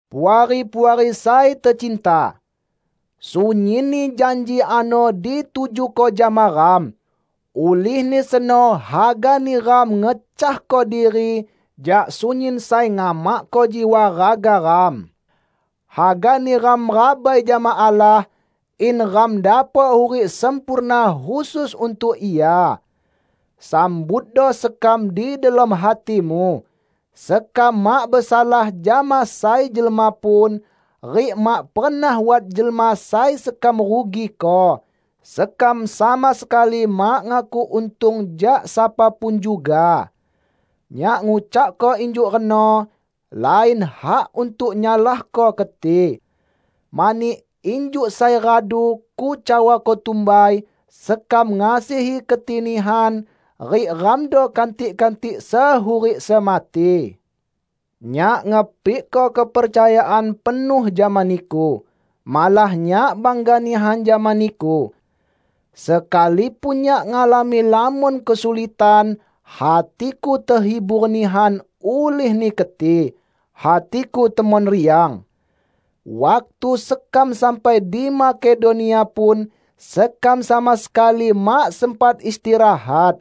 Puari-puari sai tecinta! Sunyinni janji ano ditujuko jama ram. Ulihni seno hagani ram ngecahko diri jak sunyin sai ngamakko jiwa raga ram. Hagani ram rabai jama Allah, in ram dapok hurik sempurna khusus untuk Ia. Sambutdo sekam di delom hatimu. Sekam mak besalah jama sai jelma pun, rik mak pernah wat jelma sai sekam rugiko. Sekam sama sekali mak ngakuk untung jak sapa pun juga. Nyak ngucakko injuk reno, lain hak untuk nyalahko keti. Mani, injuk sai radu kucawako tumbai, sekam ngasihi keti nihan, rik ramdo kantik-kantik sehurik semati. Nyak ngepikko kepercayaan penuh jama niku. Malah nyak bangga nihan jama niku! Sekalipun nyak ngalami lamon kesulitan, hatiku tehibur nihan ulihni keti. Hatiku temon riang! Waktu sekam sampai di Makedonia pun, sekam sama sekali mak sempat istirahat.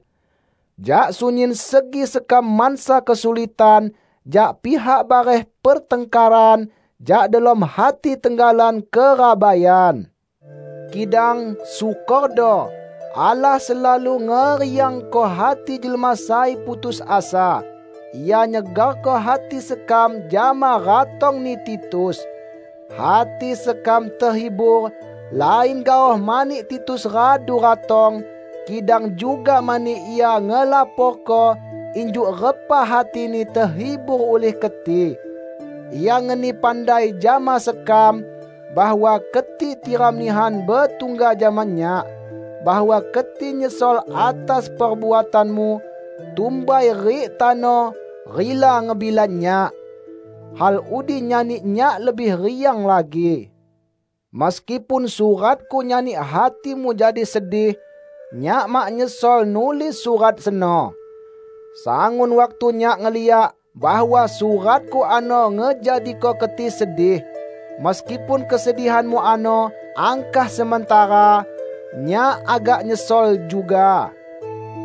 Jak sunyin segi sekam mansa kesulitan: jak pihak bareh pertangkaran, jak delom hati tenggalan kerabaian. Kidang, syukordo, Allah selalu ngeriangko hati jelma sai putus asa; Ia nyegarko hati sekam jama ratongni Titus. Hati sekam tehibur lain gaoh mani Titus radu ratong, kidang juga mani ia ngelaporko injuk repa hatini tehibur ulih keti. Ia ngeni pandai jama sekam bahwa keti tiram nihan betungga jama nyak; bahwa keti nyesol atas perbuatanmu tumbai rik tano rila ngebela nyak. Hal udi nyani nyak lebih riang lagi. Meskipun suratku nyani hatimu jadi sedih, nyak mak nyesol nulis surat seno. Sangun waktu nyak ngeliak bahwa suratku ano ngejadiko keti sedih -- meskipun kesedihanmu ano angkah sementara -- nyak agak nyesol juga.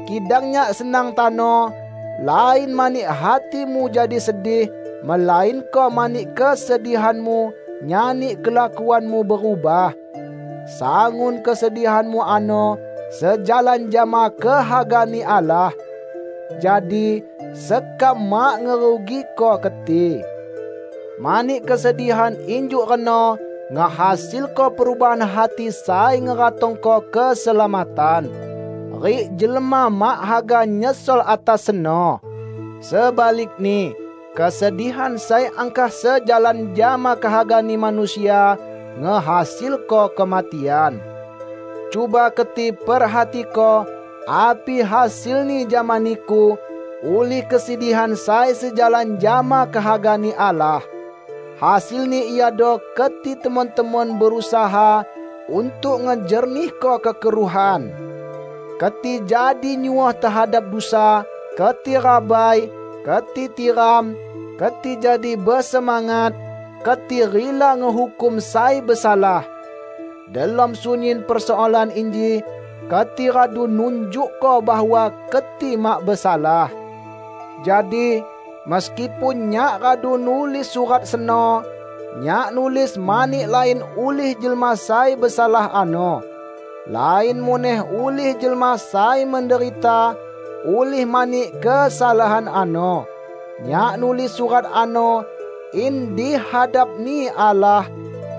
Kidang nyak senang tano -- lain mani hatimu jadi sedih, melainko mani kesedihanmu nyani kelakuanmu berubah. Sangun kesedihanmu ano sejalan jama kehaga-Ni Allah. Jadi, sekam mak ngerugiko keti. Mani kesedihan injuk reno ngehasilko perubahan hati sai ngeratongko keselamatan. Rik jelma mak haga nyesol atas seno. Sebalikni, kesedihan sai angkah sejalan jama kehagani manusia ngehasilko kematian. Cuba keti perhatiko api hasilni jama niku ulih kesedihan sai sejalan jama kehaga-Ni Allah! Hasilni iado keti temon-temon berusaha untuk ngejernihko kekeruhan! Keti jadi nyuoh tehadap dusa, keti rabai, keti tiram, keti jadi besemangat, keti rila ngehukum sai besalah! Delom sunyin persoalan inji keti radu nunjukko bahwa keti mak besalah. Jadi, meskipun nyak radu nulis surat seno, nyak nulis mani lain ulih jelma sai besalah ano. Lain muneh ulih jelma sai menderita ulih mani kesalahan ano. Nyak nulis surat ano in di hadap-Ni Allah,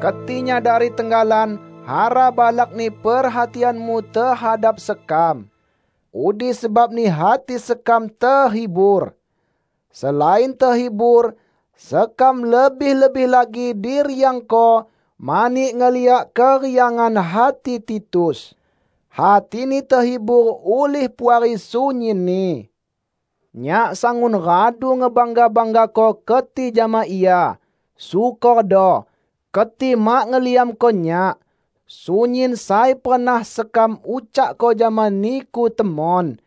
keti nyadari tenggalan hara balakni perhatianmu tehadap sekam. Udi sebabni hati sekam tehibur. Selain tehibur, sekam lebih-lebih lagi diriangko mani ngeliak keriangan hati Titus; hatini tehibur ulih Puari sunyinni. Nyak sangun radu ngebangga-banggako keti jama ia. Syukordo, keti mak ngeliamko nyak. Sunyin sai pernah sekam ucakko jama niku temon.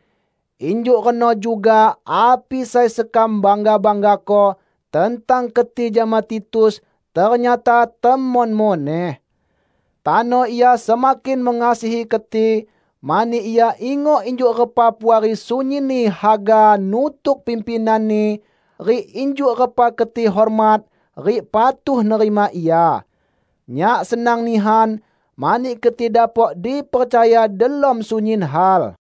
Injuk reno juga api sai sekam bangga-banggako tentang keti jama Titus ternyata temon muneh. Tano ia semakin mengasihi keti, mani ia ingok injuk repa Puari sunyinni haga nutuk pimpinanni rik injuk repa keti hormat rik patuh nerima ia. Nyak senang nihan, mani keti dapok dipercaya delom sunyin hal.